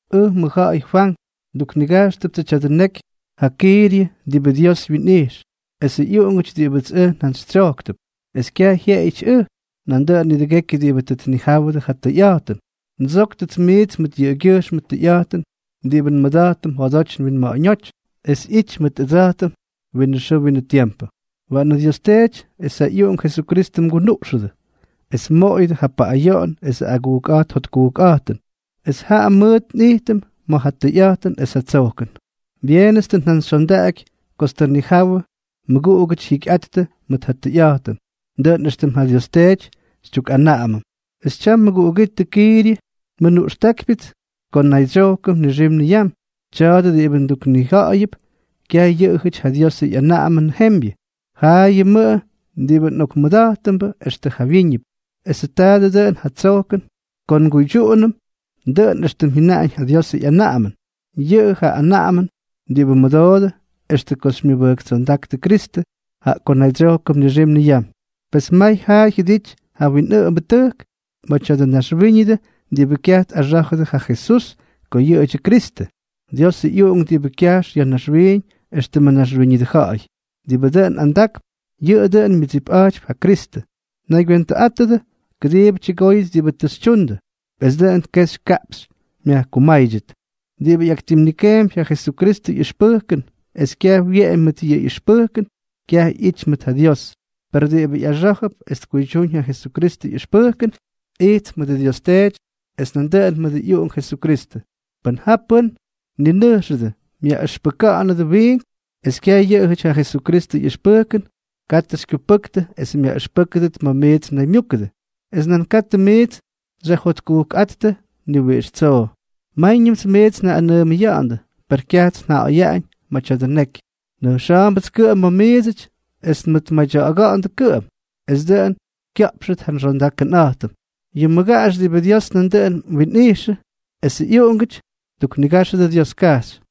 Ʉj, mʉjja̱ꞌa̱y Fwank. Nduknigajxtʉptsʉ tya̱dʉ neky ja Kiiryʉ diꞌibʉ Dios wyinꞌijx, esʉ ꞌyuꞌungʉty diꞌibʉts ʉj njantsytsyojktʉp; es kyaj jyeꞌeyʉty ʉj, nandʉꞌʉn nidʉgekyʉ diꞌibʉ tʉ tnijáwʉdʉ ja tʉyꞌa̱jtʉn. Ndsóktʉts miits mʉt yʉꞌʉgyʉjxmʉ tʉyꞌa̱jtʉn diꞌibʉ nmʉda̱jtʉm njodoty nwinma̱ꞌa̱ñóty, es ꞌyity mʉt ʉdsa̱jtʉm winʉ xʉʉ winʉ tiempʉ. Waꞌanʉ Dios Teety es ja ꞌyUꞌunk Jesukristʉ mgunuꞌxʉdʉ, es mmoꞌoyʉdʉ ja paꞌꞌayoꞌon esʉ agujkꞌa̱jt jotkujkꞌa̱jtʉn, es jaꞌa mʉʉt nꞌijtʉm ma̱ ja tʉyꞌa̱jtʉn esʉ tsojkʉn. Byeenʉts tʉ njantsyxyondaꞌaky kots tʉ nnijawʉ mꞌuꞌungʉty jyikyꞌattʉ mʉt ja tʉyꞌa̱jtʉn, dʉꞌʉn éxtʉm ja Dios Teety xytyukꞌanaꞌamʉm. Es tyam, mʉguꞌugítʉ Kiiryʉ, nmʉnuꞌxtákypyʉts ko nnaydsyojkʉm nixim niyam. Tya̱a̱dʉ diꞌibʉ nduknija̱ꞌa̱yʉp, kyaj yʉꞌʉjʉty ja Diosʉ ꞌyanaꞌamʉnʉ jembyʉ, jaꞌayʉmʉꞌʉ diꞌibʉ nꞌokmʉda̱jtʉmbʉ extʉ jawyíñʉp; esʉ tya̱a̱dʉ dʉꞌʉn ja tsojkʉn ko nguydyuꞌunʉm dʉꞌʉn éxtʉm jyʉnaꞌañ ja Diosʉ ꞌyanaꞌamʉn. Yʉꞌʉ ja anaꞌamʉn diꞌibʉ mmʉdoodʉ extʉ ko xymyʉbʉjktsondáktʉ Kristʉ, jaꞌa ko nnaydsyojkʉm nixim niyam. Pes may jaa jyʉdity ja winꞌʉꞌʉmbʉtʉjk ma̱ tya̱dʉ naxwíñʉdʉ diꞌibʉ kyaj tꞌaxá̱jʉdʉ ja Jesús ko yʉꞌʉdyʉ Kristʉ, Diosʉ ꞌyUꞌunk diꞌibʉ kyajx ya̱ naxwiiñ éxtʉmʉ naxwíñʉdʉ ja̱ꞌa̱y. Diꞌibʉ dʉꞌʉn andakp, yʉꞌʉ dʉꞌʉn myʉdsipꞌa̱jtypy ja Kristʉ. Naygywentʉꞌátʉdʉ, kʉdiibʉ tyʉgóyʉt diꞌibʉ tʉ xytyundʉ, es dʉꞌʉn kexy kaꞌpxy myajkumáydyʉt. Diꞌibʉ ꞌyaktimnikeempy ja Jesukristʉ ꞌyʉxpʉjkʉn es kyaj wyeꞌemy mʉt yʉ ꞌyʉxpʉjkʉn, kyaj ꞌyity mʉt ja Dios; per diꞌibʉ ꞌyaxá̱jʉp es tkuydyúñ ja Jesukristʉ ꞌyʉxpʉjkʉn, ijtp mʉdʉ Dios Teety es nandʉꞌʉn mʉdʉ ꞌyUꞌunk Jesukristʉ. Pʉn ja pʉ́n mninʉjxʉdʉ myaꞌʉxpʉka̱ꞌa̱nʉdʉ wiink, es kyaj yʉꞌʉjʉty ja Jesukristʉ ꞌyʉxpʉjkʉn, katʉ xykyupʉktʉ es myaꞌʉxpʉ́kʉdʉt ma̱ miits mnaymyúkʉdʉ. Es nan katʉ miits xyajjotkujkꞌáttʉ ni wiꞌix tsoo. Máyñʉmts miits njaꞌꞌanʉʉmʉya̱ꞌa̱ndʉ, per kyajts nja̱ꞌa̱yaꞌañ ma̱ tya̱dʉ neky. Nʉjxa̱a̱mbʉts kʉꞌʉm ma̱ miidsʉty es nmʉtmadya̱ꞌa̱ga̱ꞌa̱ndʉ kʉꞌʉm, es dʉꞌʉn kya̱ꞌpxʉt ja nxondakʉnꞌa̱jtʉm. Yʉ mmʉgaꞌax diꞌibʉ Dios nandʉꞌʉn winꞌijxʉ, esʉ ꞌyuꞌungʉty, mduknigáxʉdʉ Dioskajxy.